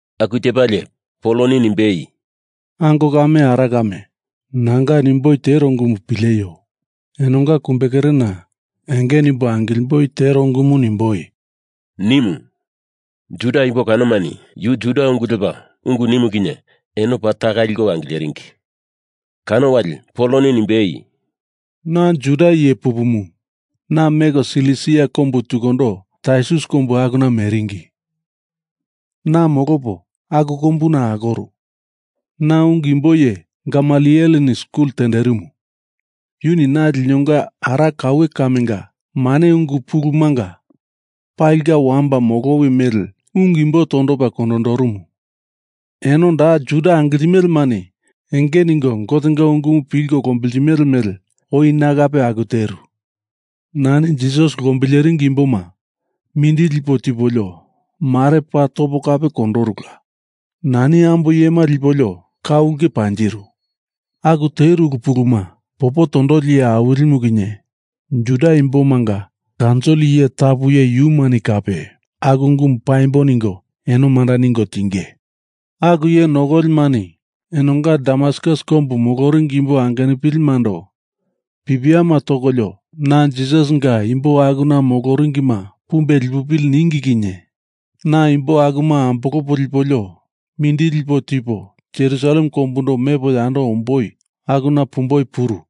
Aku tepalie Poloni nimbei, “Ango kame ara kame, nanga nimboi tero ungumu pileio. Enonga kumbekerena enge nimbo angilimboi tero ungumu nimboi,” nimu. Juda imbo kanomani yu Juda ungu lepa ungu nimu kinye eno paa taka liko angileringi. Kano wali Poloni nimbei, “Na Juda iye pupumu. Na meko Silisia kombu tukundo Tarsus kombu akuna meringi. Na molopo aku kombuna akoru. Na ungu imbo iye Gamalieleni skul tenderimu. Yuni na linonga ara kaue kamenga mane ungu ulu pulumanga palinga wamba molowi mele ungu imbo tondopa kondondorumu. Eno da Juda angiltimelemani enge ningo Gotenga ungumu pilko lombiltimele mele oi na kape aku teru. Nani Jisas lombileringi imboma mindili lipo tipolio mare paa topo kape kondorula. Nani ambo iyema lipolio ka ulke panjiru. Aku teru ulu puluma popo tondoli iye awilimu kinye Juda imbomanga kaunsil iye tapu iye yumani kape aku ungumu paimbo ningo eno manda ningo tinge. Aku iye nokolimani enonga Damaskus kombu moloringi imbo angenupilindo pipiama tokolio na Jisasinga imbo akuna moloringima pumbe lipupili ningi kinye na imbo akuma ambolopo lipolio mindili lipo tipo Jerusalem kombundo mepo yando omboi akuna pumboi puru.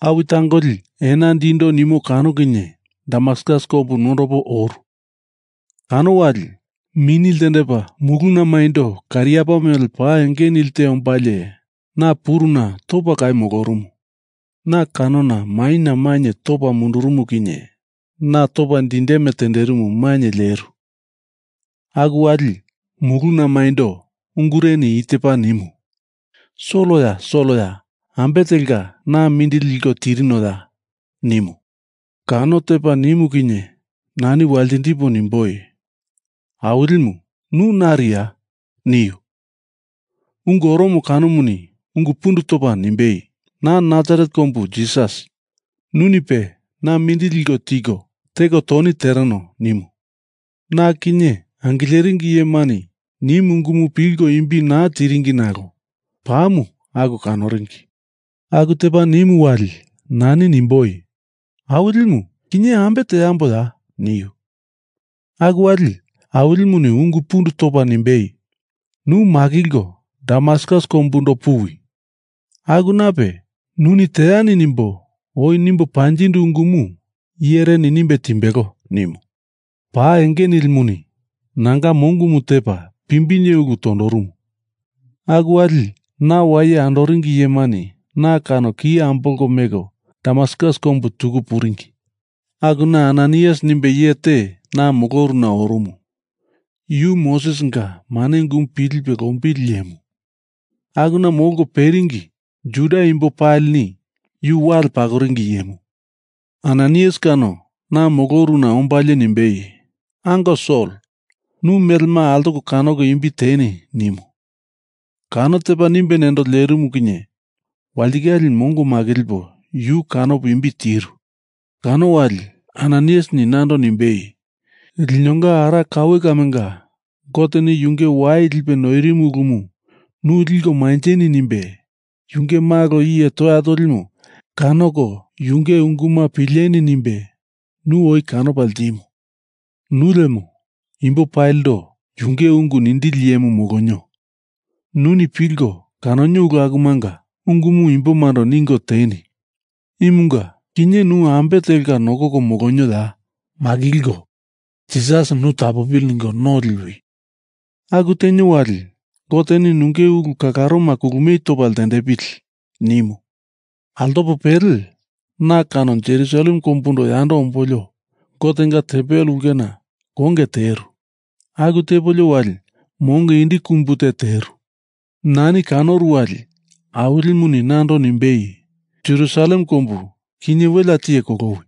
Awi tangoli ena dindo nimo kano kinye Damaskus kombu nondopo oru. Kano wali mini ltendepa muluna maindo kariapa mele pa enge nilte ombalie na puruna topa kau molorumu. Na kano maina mainye topa mundurumu kinye na topa dindeme tenderimu mainye leru. Aku wali muluna maindo ungureni i tepa nimu, ‘Soloya! Soloya, ambe telka na mindili liko tirinoya?’ nimu. Kano tepa nimu kinye nani waltindipo nimboi, ‘Awilimu nu nariya?’ niu. Ungu oromo kanomuni ungu pundu topa nimbei, ‘Na Nasaret kombu Jisas. Nunipe na mindili liko tiko teko toni tereno,’ nimu. Na kinye angileringi iyemani nimu ungumu pilko imbi naa tiringi nalo pamu aku kanoringi. Aku tepa nimu wali nani nimboi, ‘Awilimu, kinye ambe teamboya?’ niu. Aku wali Awilimuni ungu pundu topa nimbei, ‘Nu makilko Damaskus kombundo puwi. Akunape nuni teani nimbo oi nimbo panjindu ungumu iyereni nimbe timbelo,’ nimu. Pa enge nilimuni nanga mongomu tepa pimbinye ulu tondorumu. Aku wali na waye andoringi iyemani na kano ki ambolko meko Damaskus kombu tuku puringi. Akuna Ananaias nimbe iye te na moloruna orumu. Yu Mosesinga mane ungumu pilipe lombili iyemu. Akuna molko peringi Juda imbo palini yu wale pakoringi iyemu. Ananaias kano na moloruna ombalie nimbei, ‘Ango Sol, nu melema altoko kanoko imbi teni,’ nimu. Kano tepa nimbe nendo lerimu kinye walitikale mongo makilipo yu kanopo imbi tiru. Kano wali Ananaiasini nando nimbei, ‘Linonga ara kaue kamenga Goteni yunge wai lipe noirimo ulumu nu liko manjeni nimbe yunge Malo Iye Toya Tolimu kanoko yunge unguma pileni nimbe nu oi kanopa ltimu. Nu lemo imbo palindo yunge ungu nindili iyemu molonio. Nuni pilko kanonio ulu akumanga ungumu imbomando ningo teni. Imunga kinye nu ambe telka nokoko molonioya? Makilko Jisasi nu tapopili ningo no liwi. Aku tenio wali Goteni nunge ulu kalaroma kulumie topa ltendepili,’ nimu. Altopo pele na kano Jerusalem kombundo yando ombolio Gotenga tempel ulkena konge teru. Aku tepolio wali mongo indi kumbu te teru. Nani kanoru wali Awilimuni nando nimbei, ‘Jerusalem kombu kinye welea tiye kolowi.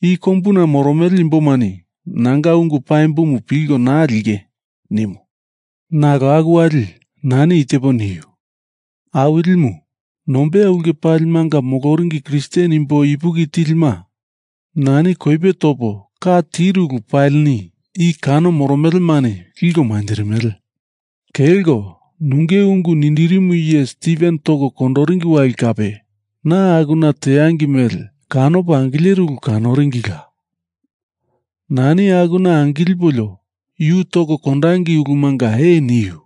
I kombuna moromele imbomani nanga ungu paimbomu pilko naa linge,’ nimu. Nalo aku wali nani i tepo niu, ‘Awilimu nombeya ulke palimanga moloringi Kristen imbo ipuki tilima nani koipe topo ka tiru ulu palini i kano moromelemani liko manjirimele. Kelko nunge ungu nindirimu iye Stiven toko kondoringi wali kape na akuna tangei mele kanopo angileru ulu kanoringila. Nani akuna angilipolio yu toko kondangei ulumunga ee niu.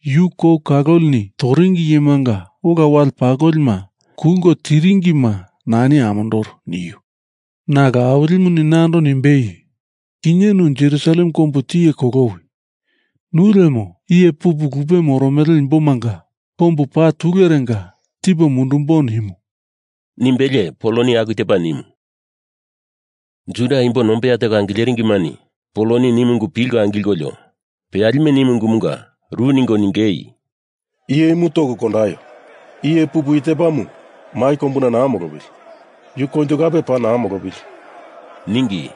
Yu kou kalolini toringi iyemanga ola wale pakolima kulko tiringima nani amondoru,’ niu. Nalo Awilimuni nando nimbei, ‘Kinye nu Jerusalem kombu tiye kolowi. Nu lemo iye pupu lupe moromele imbomanga kombu paa tulerenga tipo mundumbo’, nimu,” nimbelie Poloni aku tepa nimu. Juda imbo nombeya teko angileringimani Poloni nimu ungu pilko angilkolio peyalime nimu ungumunga ru ningo ningei, “Iye imu toko kondaio. Iye pupu i tepamu mai kombuna naa molopili. Yu koinjo kape paa naa molopili,” ningi.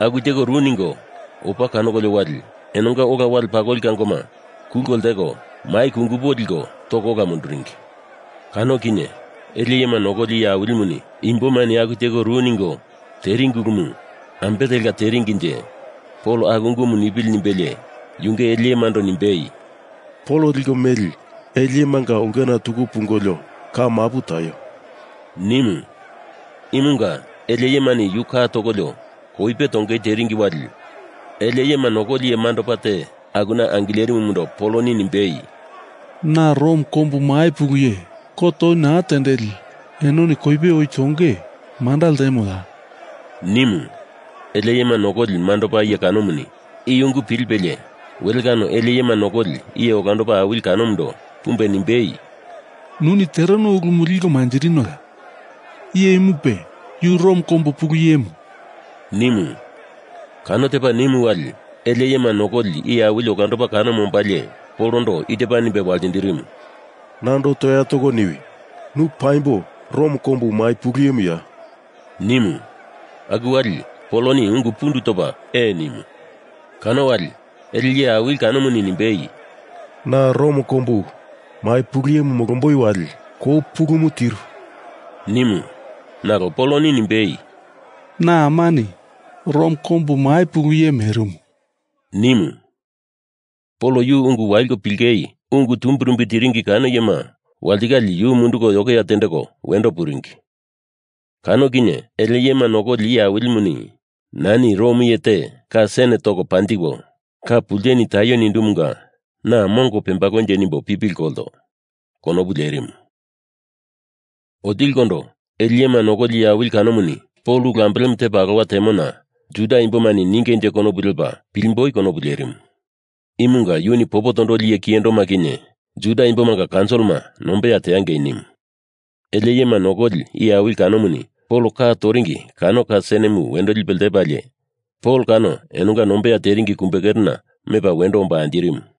Aku teko ru ningo opa kanokolio wali enonga ola wale pakoli kangoma kulko lteko mai kungupo liko toko ola munduringi. Kano kinye ele iyema nokoli iye awilimuni imbomani aku teko ru ningo teringi ulumu ambe telka teringinje Pol aku ungumu nipili nimbelie yunge ele iyemando nimbei, “Pol liko meli ele iyemanga ulkena tuku pungolio ka mapu taio,” nimu. Imunga ele iyemani yu ka tokolio koipe tongei teringi wali ele iyema nokoli iye mandopa te akuna angilerimumundo Poloni nimbei, “Na Rom kombu mai pulu iye kot oi naa tendeli enoni koipe oi tonge manda ltemoya?” nimu. Ele iyema nokoli mandopa iye kanomuni i ungu pilipelie wele kano ele iyema nokoli iye olandopa awili kanomundo pumbe nimbei, “Nuni tereno ulumu liko manjirinoya? Iye imupe yu Rom kombu pulu iyemu,” nimu. Kano tepa nimu wali ele iyema nokoli iye awili olandopa kanomu ombalie Polondo i tepa nimbe waltindirimu, “Nando toya toko niwi. Nu paimbo Rom kombu mai pulu iyemuya?” nimu. Aku wali Poloni ungu pundu topa ee nimu. Kano wali ele iye awili kanomuni nimbei, “Na Rom kombu mai pulu iye molomboi wali kou pulumu tiru,” nimu. Nalo Poloni nimbei, “Na amani Rom kombu mai pulu iye merimu,” nimu. Pol yu ungu waliko pilingei ungu tumbirumbi tiringi kano iyema walitikale yu munduko yokeya tendeko wendo puringi. Kano kinye ele iyema nokoli iye awilimuni, ‘Nani Rom iye te ka sen toko panjiko ka pulteni taio nindumunga na mongo pembalonje nimbo pipili kolto,’ konopu lerimu. Otilikondo ele iyema nokoli iye awili kanomuni Pol ulu ambelemu tepa alowa temona Juda imbomani ningeinje konopu lepa pilimboi konopu lerimu. Imunga yuni popo tondoli iye kiyendoma kinye Juda imbomanga kaunsilima nombeya teangei nimu. Ele iyema nokoli iye awili kanomuni Pol ka toringi kano ka senemu wendo lipe ltendepalie Pol kano enonga nombeya teringi kumbekerena mepa wendo omba anjirimu.